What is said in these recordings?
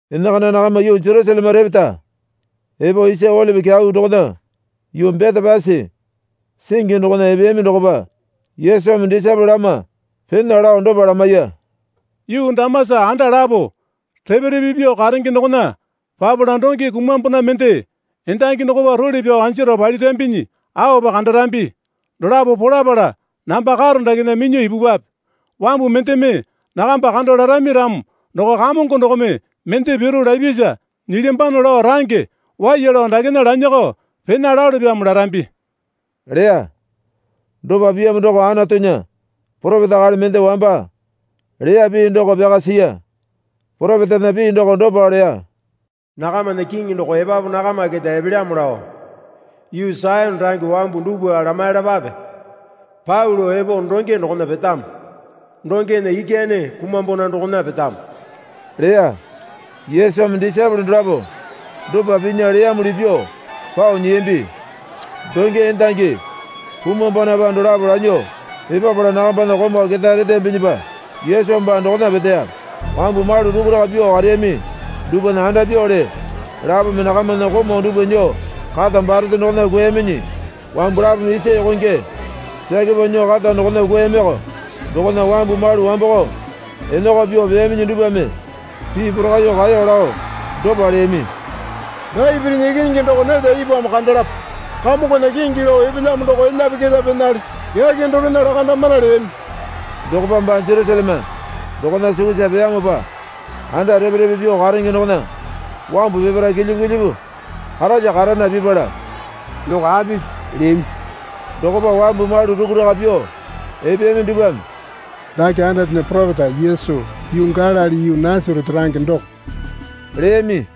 Enakana nakama yuu Jerusaleme repeta epo Isa Olipi Kyau dokona yuu Betepasi singi dokona epeyami dokopa Yesumi disaepole lama pena lao dopa lamaiya. Yuu damasa anda lapo repe repe pyuo karenge dokona papala donge kumwambona mende endangi dokopa role pyao anjaro palirambinyi aopa kandarambi. Dolapo polapala namba karo dakena minyuo ipupwape. Wambu mendeme nakamba kando larami ramo doko Kamongo dokome mende piru lapyasa nyilyambano lao range waiya lao dakena lanyakao pena lalopyamo larambi, leya. Dopa piyamo doko Anatunya poropeta akali mende wamba leya pii doko pyaka siya. Poropetana pii doko dopa leya. Nakamana Kiŋi doko epapu nakama keta epelyamo lao, Yuu Sayone range wambu dupwa lamaiyalapape. Pau lao epo donge dokona petamo, dongena ikyane kumwambona dokona petamo, leya. Yesumi disaepole dolapo dopa pinya leyamuli pyuo pao nyiyambi. Donge endangi kumwambonapa dolapo lanyuo epapala nakambana komau ketae reteyambinyipa Yesu baa dokona peteya. Wambu malu rukuraka pyuo kareyami dupwana andapyuwale lapome nakamana komau dupwa nyuo kata barete dokona kwuayaminyi wambu lapome isa yokonge pyake pyao nyuo kata dokona kwuayamiko. Dokona wambu malu wamboko enakao pyuo peyaminyi dupwame pii porakaiyuo kaeyo lao dopa leyami. Dapitinya ikinyingi doko neta ipwamo kandalapa, Kamongona kingi lao epelyamo doko elyape keta penale. Yake dorena lakandamana leyami. Dokopa baa Jerusaleme dokona sukusa peyamopa anda repe repe pyuo karenge dokona wambu peparae kilyipu kilyipu karalya karana pipala, Doko apisi? leyami. Dokopa wambu malu rukuraka pyuo epeyami dupwame, Dake Anatunya poropeta Yesu yuu Galili yuu Nasarete range doko, leyami.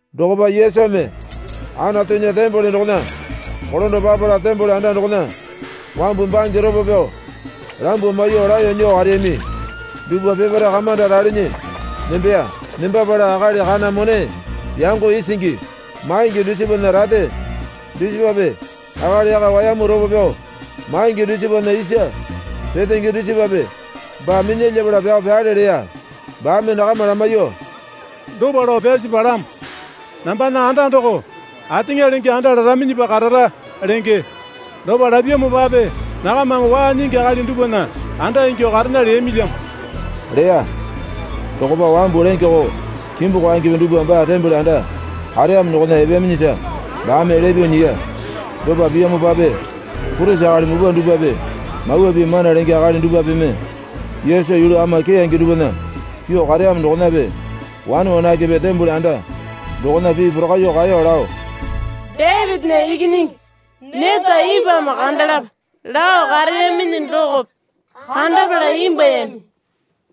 Dokopa Yesumi Anatunya tembole dokona kolando papala tembole anda dokona wambu bange ropo pyao lambuo maiyuo laeyo nyuo kareyami dupwa peparae kamanda ralinyi nembeya. Nembapala akali kana mone yango isingi maingi dusipana rate dusipape akali yaka wayamu ropo pyao maingi dusipana isa petenge dusipape baa minyalyapala pyao pyale leya. Baame nakama lamaiyuo, Dopa lao pyasi palamo. Nambana anda doko ateŋa lenge anda laraminyipa karara, lenge. Dopa lapyamopape nakamame waa nyingi akali dupwana anda ingyuo karena leyamilyamo, leya. Dokopa wambu lenge koo kimbu kwaengepe dupwa baa tembole anda kareyamo dokona epeyaminyisa baame elya pyuo nyiya. Dopa piyamopape purisi akali mupwa dupwape Mawa Pii mana lenge akali dupwapeme Yesu yulu ama keyange dupwana pyuo kareyamo dokonape wane wanakepe tembole anda dokona pii porakaiyuo kaeyo lao, Dapitinya Ikinyingi neta ipwamo kandalapa lao kareyaminyi dokope kandapala imbwuayami.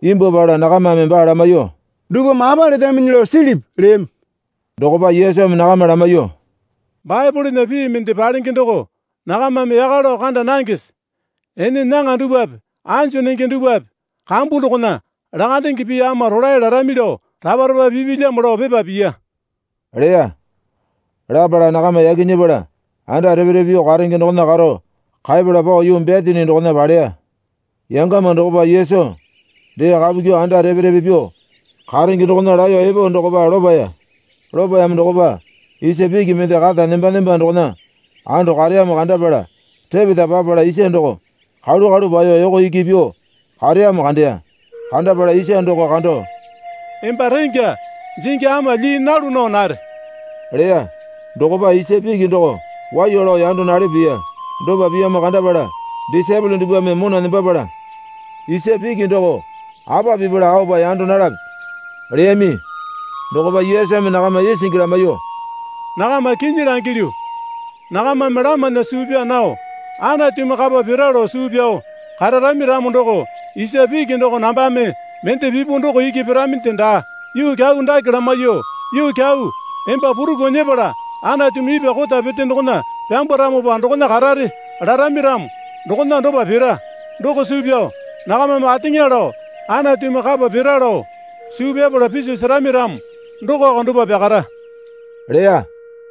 Imbwuapala nakamame baa lamaiyuo, Dupwame apa letaminyi lao silipi? leyami. Dokopa Yesumi nakama lamaiyuo, Baepolena pii mende palenge doko nakamame yaka lao kanda nangese? Ene nyaŋa dupwape anju nenge dupwape kambu dokona, lakandenge pii ama rolae larami lao rapa rapa pipilyamo lao pepa piya, leya. Lapala nakama yaki nyepala anda repe repe pyuo karenge dokona karo kaepala pao yuu Betani dokona paleya. Yangama dokopa Yesu dee kapu kyuo anda repe repe pyuo karenge dokona laeyo epo dokopa lopaya. Lopayamo dokopa isa piki mende kata nemba nemba dokona ando kareyamo kandapala repeta papala isa doko kalu kalu paeyo yoko iki pyuo kareyamo kandeya. Kandapala isa doko kando, Emba rengya jingi ama lyii nalu nao nare, leya. Dokopa isa piki doko waiya lao yando nalepo piya. Dopa piyamo kandapala disaepole dupwame mona nembapala, Isa piki doko apa pipala aopa yando nalape? leyami. Dokopa Yesumi nakama isingi lamaiyuo, Nakama kinyi langilyu. Nakamame lamana suu pyaa nao Anatumi kapa pira lao suu pyao kararami ramo doko isa piki doko nambame mende pipu doko iki piraminde daa. Yuu kyau dake lamaiyuo, Yuu kyau, emba puruku nyepala Anatumi ipwa kota pete dokona pyambwaramopa dokona karare, larami ramo dokona dopa pira. Doko suu pyao nakamame ateŋa lao Anatumi kapa pira lao suu pyapala piso serami ramo dokoko dopa pyakara, leya.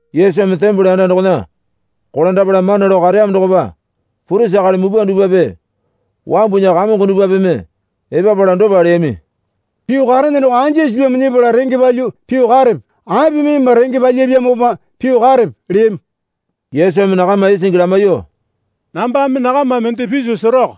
Yesumi tembole anda dokona kolandapala mana lao kareyamo dokopa purisi akali mupwa dupwape wambunya kamongo dupwapeme epapala dopa leyami. Pyuo karene doko anja sipyamo nyepala renge palyuo pyuo karene. Apimi emba renge palyapyamopa pyuo karepe? leyami. Yesumi nakama isingi lamaiyuo, Nambame nakama mende piso seroko.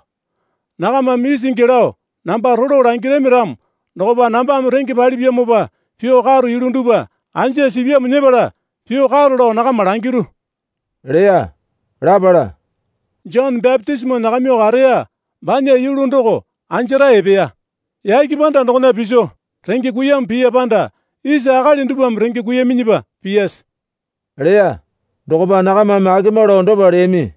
Nakamame isingi lao namba rolo langirami ramo dokopa nambame renge palipyamopa pyuo karo yulu dupwa anja sipyamo nyepala pyuo karo lao nakama langiru, leya. Lapala, Jone bapitisimo nyakamyuo kareya banya yulu doko anjarae epeya, yake panda dokona piso renge kuiyamo piya panda isa akali dupwame renge kuiyaminyipa piyase? leya. Dokopa nakamame akema lao dopa leyami.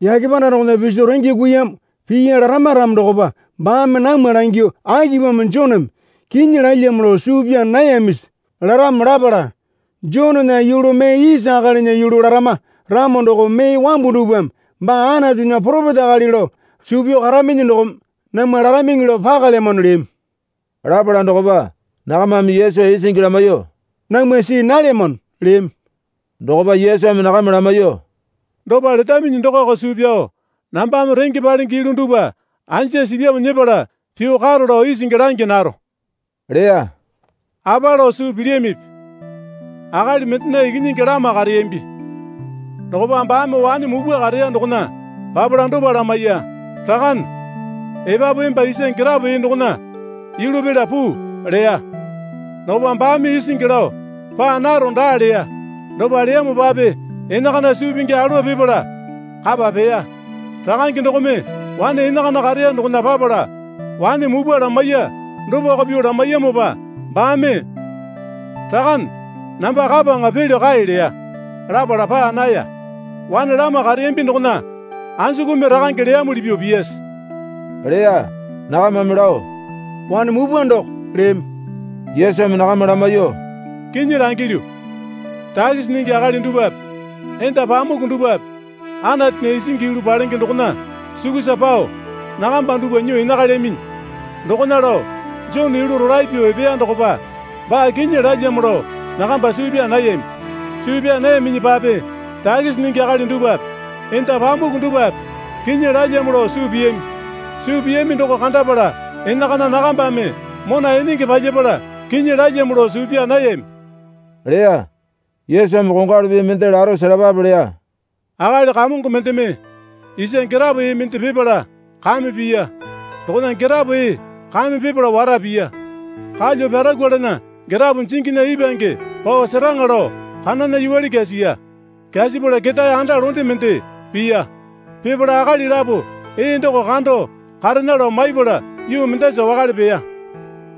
Yake panda dokona piso renge kuiyamo piya larama ramo dokopa baame namwa langyuo akipamo Joneme kinyi lalyamo lao suu pyaa nayamisi? laramo lapala Jonena yulu mee isa akalinya yulu larama ramo doko mee wambu dupwame baa Anatunya poropeta akali lao suu pyao karaminyi dokome namwa laramiŋi lao pakalyamano, leyami. Lapala dokopa nakamame Yesu isingi lamaiyuo, Namwa see nalyamano, leyami. Dokopa Yesumi nakama lamaiyuo, Dopa letaminyi dokoko suu pyao nambame renge palenge yulu dupwa anja sipyamo nyepala pyuo karo lao isingi langi naro, leya. Apa lao suu pilyamipi? Akali mendena ikinyingi lama kareyambi. Dokopa baame wane mupwa kareya dokona papala dopa lamaiya. Rakane, epapu emba isa girapo ee dokona yulu pela puu, leya. Dokopa baame isingi lao, Paa naro daa leya. Dopa leyamopape enakana suu pingi alowa pipala kapa peya. Rakange dokome wane enakana kareya dokona papala wane mupwa lamaiya dopako pyuo lamaiyamopa baame, Rakane, namba kapaŋa pelyo kae leya. Lapala paa naya. Wane lama kareyambi dokona anjukumi rakange leyamuli pyuo piyase? leya. Nakamame lao, Wane mupwa doko, leyami. Yesumi nakama lamaiyuo, Kinyi langilyu. Takisi nyingi akali dupwape enda pamuku dupwape Anatunya isingi yulu palenge dokona sukusa pao nakamba dupwa nyuo enakalyaminyi. Dokona lao Jone yulu rolae pyuo epeya dokopa baa kinyi lalyamo lao nakamba suu pyaa nayami. Suu pyaa nayaminyipape takisi nyingi akali dupwape enda pamuku dupwape kinyi lalyamo lao suu piyami. Suu piyami doko kandapala enakana nakambame mona enenge palyapala kinyi lalyamo lao suu pyaa nayami, leya. Yesumi kongwalu pii mende laro selapape leya. Akali kamongo mendeme isa girapo ee mende pipala kame piya. Dokona girapo ee kame pipala wara piya. Kalyuo pyarakwalana girapo jinginya ipwange pao seraŋa lao kanana yuwale kyasiya. Kyasapala ketae anda londe mende piya. Pipala akali lapo ee doko kando karena lao maipala yuu mendasa wakale peya.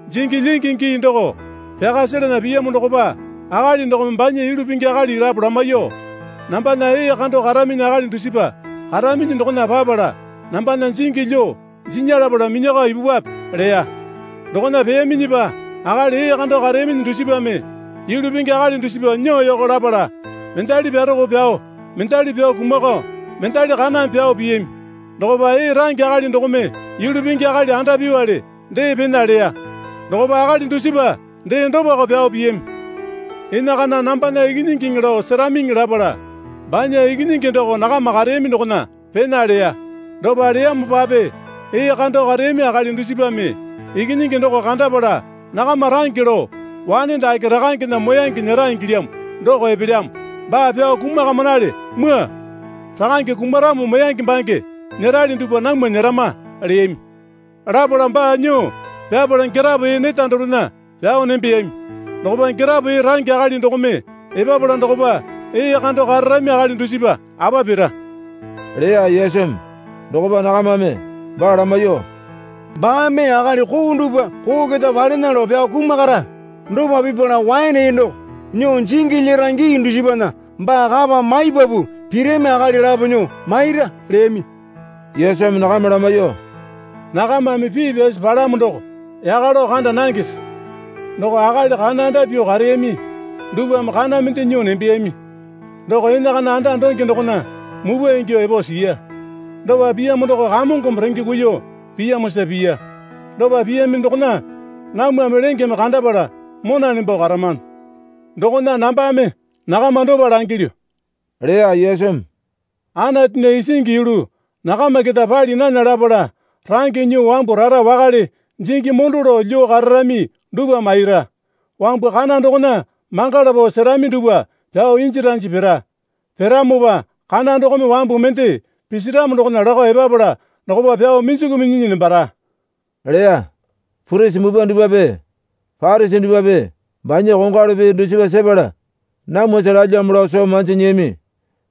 Jingi lyingi gii doko pyaka selena piyamo dokopa akali dokome banya yulu pingi akali lapo lamaiyuo, Nambana ee kando karaminyi akali dusipa karaminyi dokona papala nambana jingi lyuo jinya lapala minyakao ipupwape, leya. Dokona peyaminyipa akali ee kando kareyaminyi dusipame yulu pingi akali dusipa nyuo yoko lapala mendali pyaroko pyao mendali pyao kumakao mendali kaname pyao piyami. Dokopa ee range akali dokome yulu pingi akali andapyuwale dee pena leya. Dokopa akali dusipa dee dopako pyao piyami. Enakana nambana ikinyingiŋi lao seramiŋi lapala banya ikinyingi doko nakama kareyami dokona pena leya. Dopa leyamopape ee kando kareyami akali dusipame ikinyingi doko kandapala nakama range lao, Wane dake rakangena moyange nyera ingilyamo doko epelyamo. Baa pyao kumakamanale, mwua. Rakange kumaramo moyange baa nyerali dupwa namwa nyerama, leyami. Lapala baa nyuo pyapala girapo ee neta dorena pyao nembeyami. Dokopa girapo ee range akali dokome epapala dokopa ee kando kararami akali dusipa apa pira, leya Yesumi. Dokopa nakamame baa lamaiyuo, Baame akali koo dupwa koo keta palena lao pyao kumakara. Dopa pipala waene ee doko nyuo jingi lyera gii dusipana baa kapa maipapu pirami akali lapo nyuo maira, leyami. Yesumi nakama lamaiyuo, Nakamame pii pyasi palamo doko yaka lao kanda nangese? Doko akali kana anda pyuo kareyami dupwame kana mende nyuo nembeyami, doko enakana anda donge dokona mupwa ingyuo epo siya. Dopa piyamo doko Kamongome renge kuiyuo piyamosa piya. Dopa piyami dokona namwame lengeme kandapala mona nembo karamano. Dokona nambame nakama dopa langilyu, leya Yesumi. Anatunya isingi yulu nakama keta pali nana lapala range nyuo wambu rara wakale jingi mondo lao lyuo kararami dupwa maira. Wambu kana dokona mangala pao serami dupwa pyao inji ranji pira. Piramopa kana dokome wambu mende pisiramo dokona lakao epapala dokopa pyao minjiku minyinyi nembara, leya. Purisi mupwa dupwape Parisi dupwape banya kongwalu pii dusipa sepala namwasa lalyamo lao soo manji nyiyami.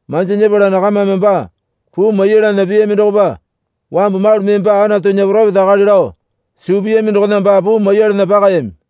Manji nyepala nakamame baa puu maiyalana piyami dokopa wambu malu mee baa Anatunya poropeta akali lao suu piyami dokona baa puu maiyalana pakayami.